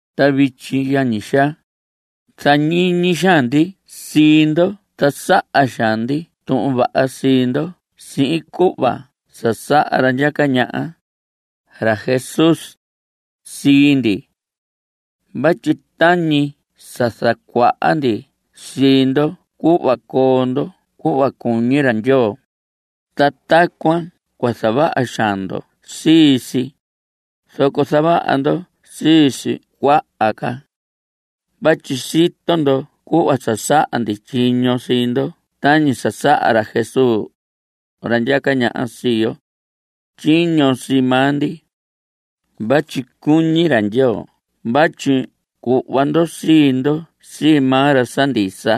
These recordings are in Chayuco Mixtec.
Ta vityi, yañi xaa, zañiñi xaan ndi sii ndo ta saha xaan ndi tuhun vaha sii ndo sihin cuhva sa saha ra ndyaca ñaha, ra Jesús, sii ndi. Vatyi tañi sa zacuaha ndi sii ndo cuhva coo ndo cuhva cuñi ra Ndyoo, ta tacuan cua zavaha xaan ndo sii si; zoco zavaha ndo sii si cuaha ca. Vatyi sito ndo cuhva sa saha ndi tyiño sii ndo tañi sa saha ra Jesús, ra ndyaca ñaha sii yo, tyiño sii maa ndi. Vatyi cuñi ra Ndyoo vatyi cuhva ndo sii ndo sii maa ra sa ndisa.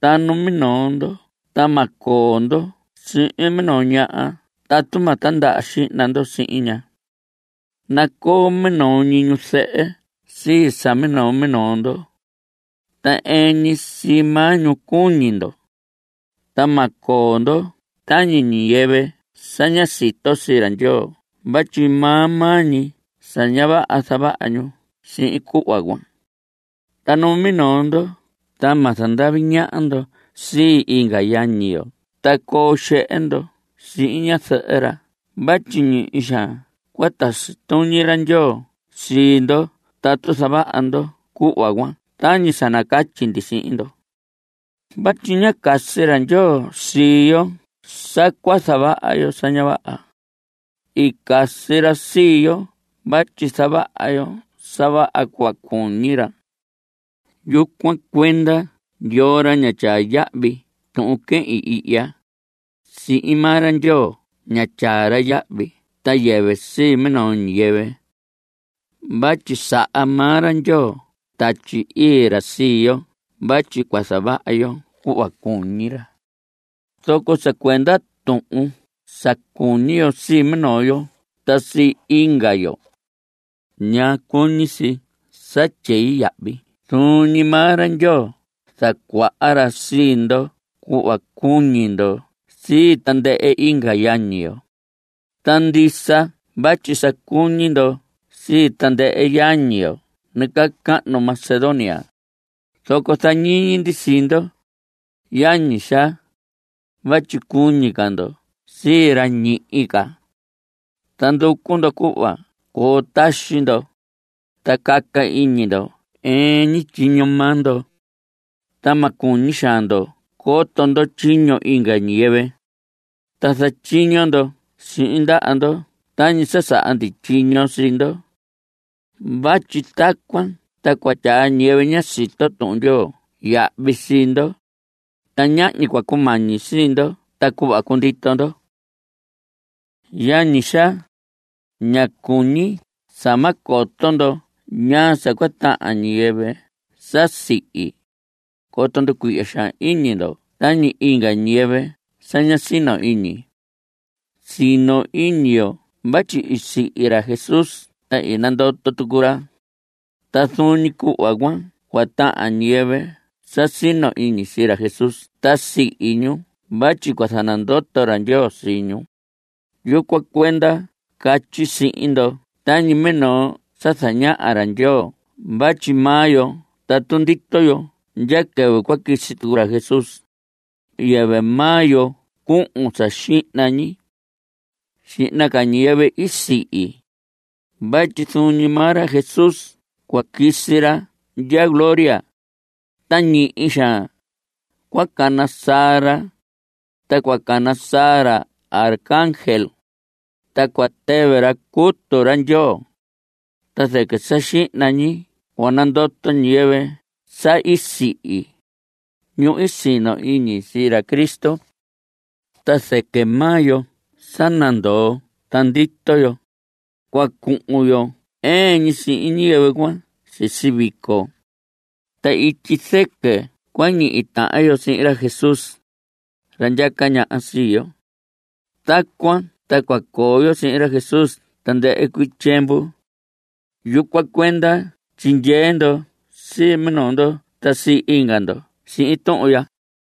Ta numinoo ndo ta ma coo ndo sihin minoo ñaha tatu ma tindaha xihna ndo sihin ña. Nacoo minoo ñi ñuzɨhɨ sii sa minoo minoo ndo. Ta ɨɨn ñi sii maa ñu cuñi ndo. Ta ma coo ndo tañi ñiyɨvɨ sa ña sito sii ra Ndyoo vatyi maa maa ñi sa ña vaha zavaha ñu sihin cuhva cuan. Ta numinoo ndo ta ma zandavi ñaha ndo sii inga yañi yo ta coo xehe ndo sihin ñazɨhɨ ra vatyi ñihi xaan cua tasi tuñi ra Ndyoo sii ndo tatu zavaha ndo cuhva cuan tañi sa nacatyi ndi sihin ndo. Vatyi ñá casi ra Ndyoo sii yo sa cua zavaha yo sa ña vaha. I casi ra sii yo vatyi zavaha yo sa vaha cuhva cuñi ra. Yucuan cuenda yoo ra sa ña tyaa yahvi tuhun quehin ihya, sii maa ra Ndyoo ña tyaa ra yahvi ta yɨvɨ sii minoo ñiyɨvɨ. Vatyi saha maa ra Ndyoo Tatyi Ii ra sii yo vatyi cua zavaha yo cuhva cuñi ra. Zoco sa cuenda tuhun sa cuñi yo sii minoo yo ta sii inga yo, ña cuñi si sa tyei vatyi zuun ñi maa ra Ndyoo zacuaha ra sii ndo cuhva cuñi ndo sii tandɨhɨ inga yañi yo. Ta ndisa vatyi sa cuñi ndo sii tandɨhɨ yañi yo nacahnu Macedonia, zoco zañiñi ndi sii ndo, yañi xaa, vatyi cuñi ca ndo sii ra ñihi ca. Ta nducu ndo cuhva coo taxi ndo, ta caca iñi ndo ɨɨn ñi tyiño maa ndo. Ta ma cuñi xaan ndo coto ndo tyiño inga ñiyɨvɨ. Ta zatyiño ndo sihin ndaha ndo tañi sa saha ndi tyiño sii ndo. Vatyi tacuan ta cua tyaa ñiyɨvɨ ña sito Tuhun Ndyoo yahvi sii ndo, ta ñahñi cua cumañi sii ndo ta cuhva cundito ndo. Yañi xaa, ña cuñi sa ma coto ndo ñaa sa cua tahan ñiyɨvɨ sa sihi, coto nducuihya xaan iñi ndo tañi inga ñiyɨvɨ sa ña sino iñi. Sino iñi yo vatyi i sihi ra Jesús ta i nandoto tucu ra. Ta zuun ñi cuhva cuan cua tahan ñiyɨvɨ sa sino iñi sii ra Jesús ta sihi ñu vatyi cua zanandoto ra Ndyoo sii ñu. Yucuan cuenda catyi ndi sihin ndo tañi minoo sa zañaha ra Ndyoo vatyi maa yo tatu ndito yo ndya quɨvɨ cua quisi ra Jesús, yɨvɨ maa yo cuhun sa xihna ñi. Xihna ca ñiyɨvɨ i sihi. Vatyi zuun ñi maa ra Jesús cua quisi ra ndya gloria, ta ñihi xaan cua cana saa ra, ta cua cana saa ra arcángel, ta cua tɨvɨ ra cutu ra Ndyoo. Ta zɨquɨ sa xihna ñi cua nandoto ñiyɨvɨ sa i sihi, ñu i sino iñi sii ra Cristo. Ta zɨquɨ maa yo sa nandoo ta ndito yo, cua cuhun yo ɨɨn ñi sihin ñiyɨvɨ cuan sisi vico. Ta ityi zɨquɨ cua ñihi tahan yo sihin ra Jesús, ra ndyaca ñaha sii yo. Tacuan ta cua coo yo sihin ra Jesús tandɨhɨ cuii tyiemvu. Yucuan cuenda tyindyee ndo sii minoo ndo ta sii inga ndo sihin tuhun ya.